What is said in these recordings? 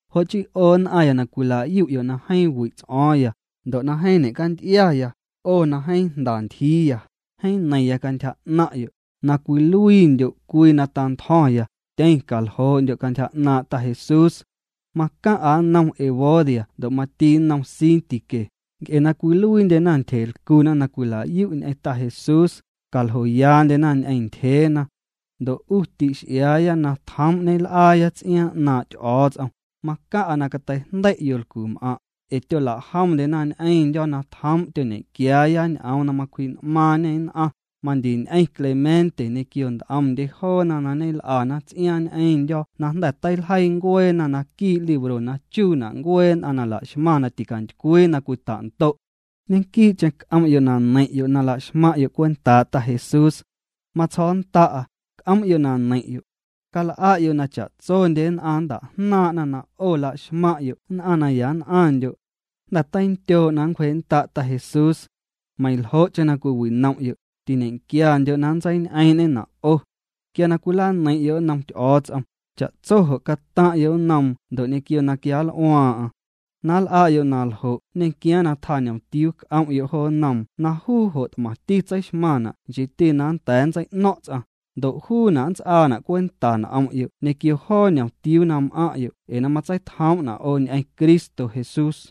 Jo' chii 'o nn'aⁿya na cwila'yu'yo' na jeeⁿ wi' ts'o̱o̱ⁿya, ndo' na jeeⁿ ñe'canty'iaya, 'o na jeeⁿ jnda ntyjiiya, jeeⁿ neiⁿya cantyja 'naⁿ'yo', na cwiluiindyo' cwii na tantjo̱ⁿya, tyeⁿ caljoo'ndyo' cantyja 'naaⁿ' Ta Jesús. Macaⁿ'a nnom Evodia ndo' mati nnom Síntique, nc'e na cwiluiindyena ntyjelcuna na cwila'yu' ñ'eⁿ Ta Jesús, caljoyaandyena ñ'eⁿ ntyjeena. Ndo' 'u ti'x'iaaya na tjoom' ñel'aaya ts'iaaⁿ 'naaⁿ' Ty'o̱o̱ts'om, macaⁿ'a na cateijndei' yolcum'aⁿ', ee tyolajomndyena ñ'eⁿndyo̱ na tjoom' tyoñequiaaya ñ'oom na macwji'n'maaⁿñê nn'aⁿ, mandiñ'eⁿ Clemente ñequio nt'omndye joona na ñel'ana ts'iaaⁿ ñ'eⁿndyo̱ na jnda̱ teiljeii ncueena naquii' libro na chuuna' ncuee nn'aⁿ na laxmaⁿ na ticantycwii na cwita'ndo'. Ñequii'cheⁿ c'om'yo' na neiⁿ'yo' na laxmaⁿ'yo' cwentaa' Ta Jesús. Matsjo̱o̱nnda'a: C'om'yo' na neiⁿ'yo'. Cal'a'yo' na cha'tsondye nn'aⁿ nnta'jnaaⁿ'na na 'o la'xmaⁿ'yo' nn'aⁿ na yann'aⁿndyo'. Jnda̱ teindyoo' na nncwjee'nnda' Ta Jesús. Meiⁿljo'cheⁿ na cwiwinom'yo', tiñequiandyo' na nntseiñ'eeⁿ'ñena' 'o. Quia na cwilaneiⁿ'yo' nnom Ty'o̱o̱ts'om, cha'tso jo' cataⁿ'yo' nnoom ndo' ñequio na quianl'uaaⁿ'aⁿ. Na nl'a'yo' na ljo' nñequiaaⁿ na tjaa ñomtiuu c'om'yo' jo nnoom na juu jo' t'mati tseixmaⁿna' nchiiti na nnda̱a̱ nntsei'ño̱ⁿ' ts'aⁿ, ndo' juuna' nnts'aana' cwenta n'om'yo' ñequio joo ñomtiuu na m'aⁿ'yo' ee na matseitjoom'na' 'o ñ'eⁿ Cristo Jesús.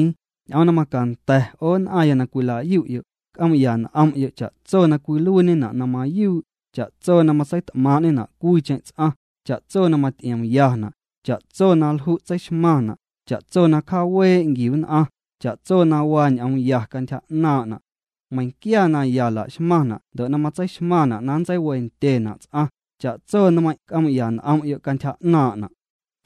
Ñ'oom na macanda̱ 'o nn'aⁿya na cwila'yu'yo', c'oom'ya n'om'yo' cha'tso na cwiluiiñena' na mayuu', cha'tso na matseit'maaⁿ'ñena' cwiicheⁿ ts'aⁿ, cha'tso na maty'iomyana', cha'tso na lju' tseixmaⁿna', cha'tso na cjaawee' nquiu nn'aⁿ, cha'tso na waa ñ'oom ya cantyja 'naaⁿ'na'. Meiⁿnquia na ya laxmaⁿna' ndo' na matseixmaⁿna' na nntseiwendyena' ts'aⁿ, cha'tso nmeiⁿ' c'oom'ya n'om'yo' cantyja 'naaⁿna'.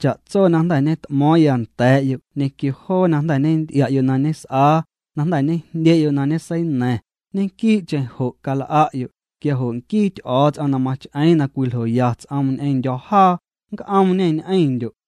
Cha'tso na jnda̱ ñet'mo̱o̱ⁿya nda̱a̱'yo' ñequio joo na jnda̱ ñenty'ia'yo' na ñes'aa, na jnda̱ ñejndye'yo' na ñeseina̱ⁿ, ñequii'cheⁿ jo' cal'a'yo', quia jo' nquii Ty'o̱o̱ts'om na mach'eeⁿ na cwiljoya ts'oom ñ'eⁿndyo̱ jaa, nc'oomñê ñ'eⁿndyo'.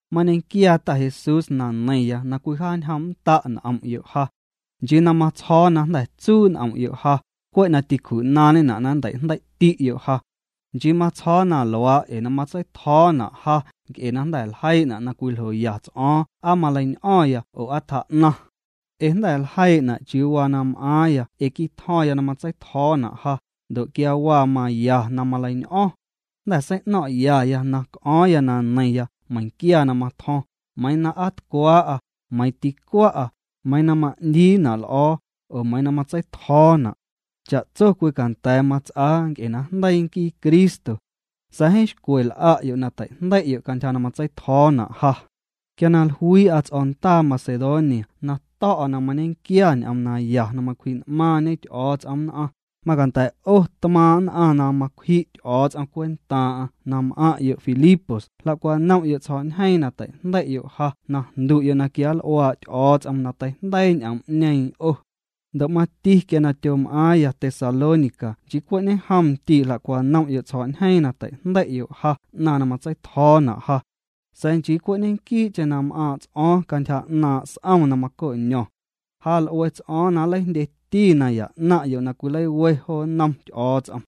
Mañequiaa Ta Jesús na neiⁿya na cwijaañjoom'nnda' n'om'yo' ja. Nchii na matsjo̱o̱ na jnda̱ tsuu' n'om'yo' ja, cwe' na tîcju'naaⁿñena' na nnteijndei'ti'yo' ja. Nchii matsjo̱o̱ na luaa' ee na matseitjo̱o̱na' ja nc'e jnda̱ ljeii'na' na cwiljoya ts'o̱o̱ⁿ aa maleiñ'o̱ⁿya oo aa tjaa'naⁿ. Ee jnda̱ ljeii'na' chiuu waa na m'aaⁿya ee quitjo̱ⁿya na matseitjo̱o̱na' ja, ndo' quia waa maya na maleiñ'o̱ⁿ. Jnda̱ sei'no̱ⁿ'yaya na c'o̱o̱ⁿya na neiⁿya meiⁿquia na matjo̱ⁿ, meiiⁿ na aa tcwaa'a, meiiⁿ ticwa'a, meiiⁿ na ma'ndiina' l'o̱o̱, oo meiiⁿ na matseitjo̱o̱na'. Cha'tso cwicanda̱a̱ mats'aa nc'e najndeii nquii Cristo. Sa̱a̱ jeeⁿ xcwe l'a'yo' na teijndei'yo' cantyja na matseitjo̱o̱na' ja. Quia na jluii'a ts'o̱ndaa Macedonia na to̱'a na mañequia ñ'oom naya na macwji'n'maaⁿñe Ty'o̱o̱ts'om nn'aⁿ, macanda̱ 'o tmaaⁿ' nn'aⁿ na macwji' Ty'o̱o̱ts'om cwentaaⁿ'aⁿ na m'aⁿ'yo' Filipos jla'cwanom'yo' tsjo̱'ñjeeⁿ na teijndei'yo' ja na jndu'yo' na quianl'uaa' Ty'o̱o̱ts'om na teijndeii ñ'oom'ñeeⁿ 'o. Ndo' mati quia tyom'aaⁿya Tesalónica nchii cwe' ñejom ndii' jla'cwanom'yo' tsjo̱'ñjeeⁿ na teijndei'yo' ja 'naⁿ na matseitjo̱o̱na' ja. Sa̱a̱ nchii cwe' ñequii'cheⁿ na m'aaⁿ' ts'o̱o̱ⁿ cantyja 'naaⁿ' s'om na maco'ño̱ⁿ. Ja l'ue ts'o̱o̱ⁿ nleijndyeti naya 'naⁿ'yo' na cwileiwe jo nnom Ty'o̱o̱ts'om.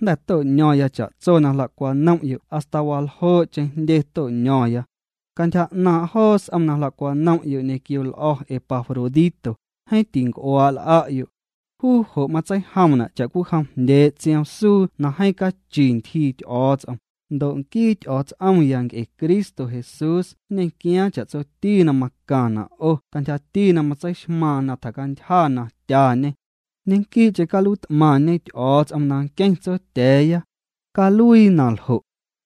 Jnda̱ to'ño̱ⁿya cha'tso na jla'cwanom'yo' hasta waljoo'cheⁿ jndye to'ño̱ⁿya. Cantyja 'naaⁿ' joo s'om na jla'cwanom'yo' ñequio l'o̱ Epafrodito, jeeⁿ tinc'uaa' l'a'yo'. Juu jo' matseijomna' cha'cwijom jndyee' tsioom suu na jeeⁿ cachi ntyjii Ty'o̱o̱ts'om, Ndo' nquii Ty'o̱o̱ts'omya nc'e Cristo Jesús nñequiaaⁿ cha'tsoti na macaⁿna' 'o cantyjati na matseixmaaⁿ na tjacantyja na tyañê. Ñequii'cheⁿ caluiit'maⁿñe Ty'o̱o̱ts'om na nqueⁿ Tsotya̱a̱ya. Caluii na ljo'.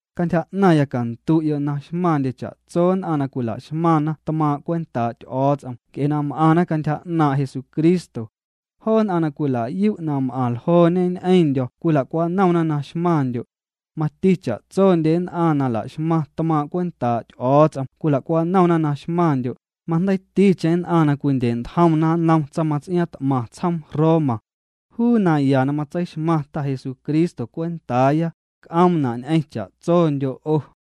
Cantyja 'naⁿya candu'yo' na xmaⁿndye cha'tso nn'aⁿ na cwila'xmaⁿna tmaaⁿ' cwentaa' Ty'o̱o̱ts'om nc'e m'aⁿna cantyja 'naaⁿ' Jesucristo. Joo nn'aⁿ na cwila'yu' na m'aⁿ ljooñe ñ'eⁿndyo̱ cwila'cwanomna na xmaⁿndyo'. Mati cha'tsondye nn'aⁿ na la'xmaⁿna tmaaⁿ' cwentaa' Ty'o̱o̱ts'om cwila'cwanomna na xmaⁿndyo', majndeiiticheⁿ nn'aⁿ na cwindye'ntjomna nnom tsaⁿmats'iaaⁿt'maⁿ tsjoom Roma. Juu naya na matseixmaⁿ Ta Jesucristo cwentaaya, c'oomna' ñ'eⁿ cha'tsondyo' 'o.